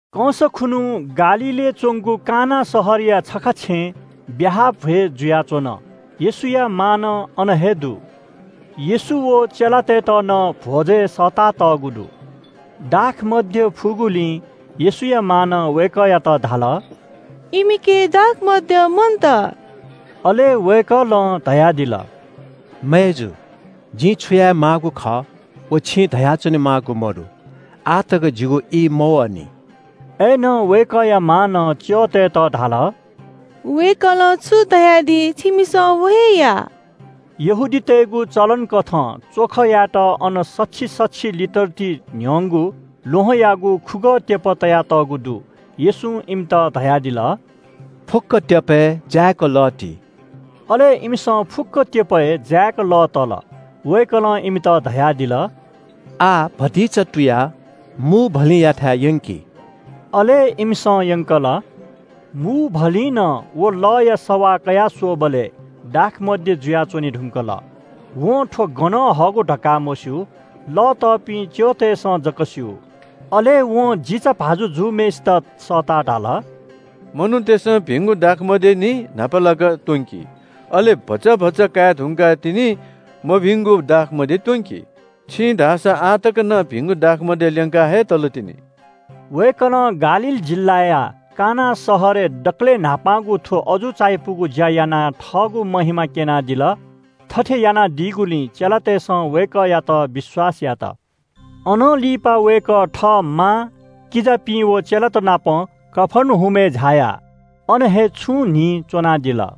कंस खुन्‍हु गालीलय् च्‍वंगु काना शहरया छखा छेँय् ब्‍याहा भ्‍वय् जुयाच्‍वन। येशूया मां नं अन हे दु। येशू व चेलातय्‌त नं भ्‍वजय् सःतातःगु दु। दाखमद्य फुगुलिं येशूया मांनं वय्‌कःयात धाल – “इमिके दाखमद्य मन्‍त।” अले वय्‌कलं धयादिल – “मय्‌जु, जिं छु यायेमाःगु खः, व छिं धया च्‍वनेमाःगु मदु। आः तक जिगु ई मवःनि।” अय्‌नं वय्‌कःया मांनं च्‍यःतय्‌त धाल – “वय्‌कलं छु धयादी छिमिसं व हे या।” यहूदीतय्‌गु चलन कथं च्‍वख यायेत अन सछि-सछि लिटर ति न्‍ह्यंगु ल्‍वहंयागु खुगः त्‍यप तयातःगु दु। येशूं इमित धयादिल – “फुक्‍क त्‍यपय् जाय्‌क लः ति।” अले इमिसं फुक्‍क त्‍यपय् जाय्‌क लः तल। वय्‌कलं इमित धयादिल – “आः भतिचा तुयाः मूभलिंयाथाय् यंकि।” अले इमिसं यंकल। मूभलिंनं व लःया सवाः कयास्‍वःबलय् दाखमद्य जुयाच्‍वने धुंकल। वं थ्‍व गनं हःगु धकाः मस्‍यू। लः तःपिं च्‍यःतय्‌सं जक स्‍यू। अले वं जिचाभाजु जूम्‍हय्‌सित सःताः धाल – “मनूतय्‌सं भिंगु दाखमद्य निं न्‍हापालाक त्‍वंकी, अले भचा भचा काये धुंकाः तिनि मभिंगु दाखमद्य त्‍वंकी। छिं धाःसा आः तक नं भिंगु दाखमद्य ल्‍यंका हे तलतिनि।” वय्‌कलं गालील जिल्‍लाया काना शहरय् दकलय् न्‍हापांगु थ्‍व अजू चायापुगु ज्‍या यानाः थःगु महिमा क्‍यनादिल। थथे यानादीगुलिं चेलातय्‌सं वय्‌कःयात विश्‍वास यात। अनं लिपा वय्‌कः थः मां, किजापिं व चेलात नाप कफर्नहुमय् झायाः अन हे छुं न्‍हि च्‍वनादिल।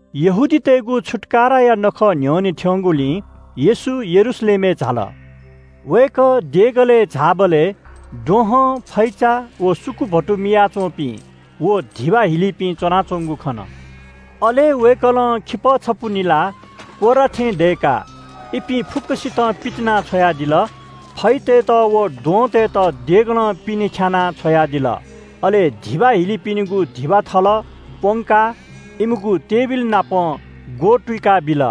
यहूदीतय्‌गु छुत्‍काराया नखः न्‍ह्यःने थ्‍यंगुलिं येशू यरूशलेमय् झाल। वय्‌कः देगलय् झाःबलय् द्वहं, फैचा, व सुकुभतु मियाच्‍वंपिं व धिबा हिलीपिं च्‍वनाच्‍वंगु खन। अले वय्‌कलं खिपः छपु निलाः कोर्रा थें दय्‌काः इपिं फुक्‍कसितं पितिनाछ्वयादिल। फैतय्‌त व द्वहंतय्‌त देगलं पिने ख्‍यानाः छ्वयादिल। अले धिबा हिलीपिनिगु धिबा थल प्‍वंकाः इमिगु टेबिलनापं ग्‍वतुइकाबिल।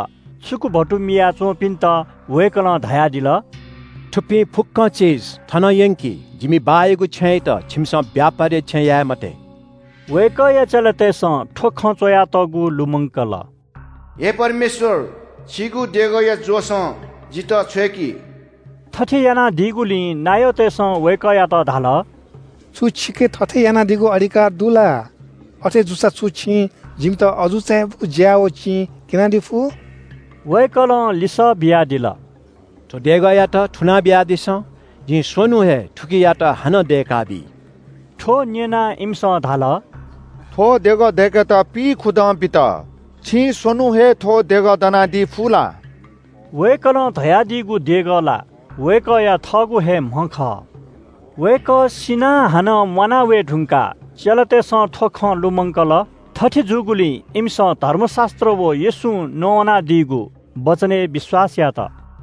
सुकुभतु मिया च्‍वंपिन्‍त वय्‌कलं धयादिल – “थुपिं फुक्‍कं चिज थनं यंकि, जिमि बाःयागु छेँयात छिमिसं ब्‍यापारया छेँ याये मते।” वय्‌कःया चेलातय्‌सं थ्‍व खँ च्‍वयातःगु लुमंकल – “हे परमेश्‍वर, छिगु देगःया जोशं जितः छ्वय्‌की।” थथे यानादीगुलिं नायःतय्‌सं वय्‌कःयात धाल – “छु छिके थथे यानादीगु अधिकार दु ला? अथे जूसा छु छिं जिमित अजू चायापुगु ज्‍या व चिं क्‍यनादी फु?” वय्‌कलं लिसः बियादिल – “थ्‍व देगःयात थुना बियादिसँ, जिं स्‍वन्‍हुं हे थुकियात हानं दय्‌काबी।” थ्‍व न्‍यनाः इमिसं धाल – “थ्‍व देगः दय्‌केत पिइखुदँ बित, छिं स्‍वन्‍हुं हे थ्‍व देगः दनादी फु ला?” वय्‌कलं धयादीगु देगः ला वय्‌कःया थःगु हे म्‍ह खः। वय्‌कः सिनाः हानं म्‍वाना वये धुंकाः चेलातय्‌सं थ्‍व खँ लुमंकल। थथे जूगुलिं इमिसं धर्मशास्‍त्र व येशूं नवानादीगु वचनय् विश्‍वास यात।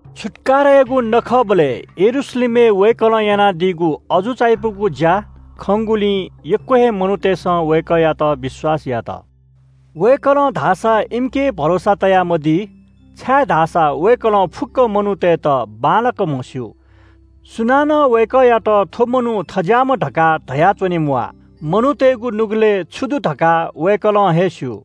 छुत्‍काराया नखःबलय् यरूशलेमय् वय्‌कलं यानादीगु अजू चायापुगु ज्‍या खंगुलिं यक्‍व हे मनूतय्‌सं वय्‌कःयात विश्‍वास यात। वय्‌कलं धाःसा इमिके भरोसा तयामदी, छाय्‌धाःसा वय्‌कलं फुक्‍क मनूतय्‌त बांलाक म्‍हस्‍यू। सुनानं वय्‌कःयात थ्‍व मनू थज्‍याःम्‍ह धकाः धयाच्‍वने म्‍वाः। मनूतय्‌गु नुगलय् छु दु धकाः वय्‌कलं हे स्‍यू।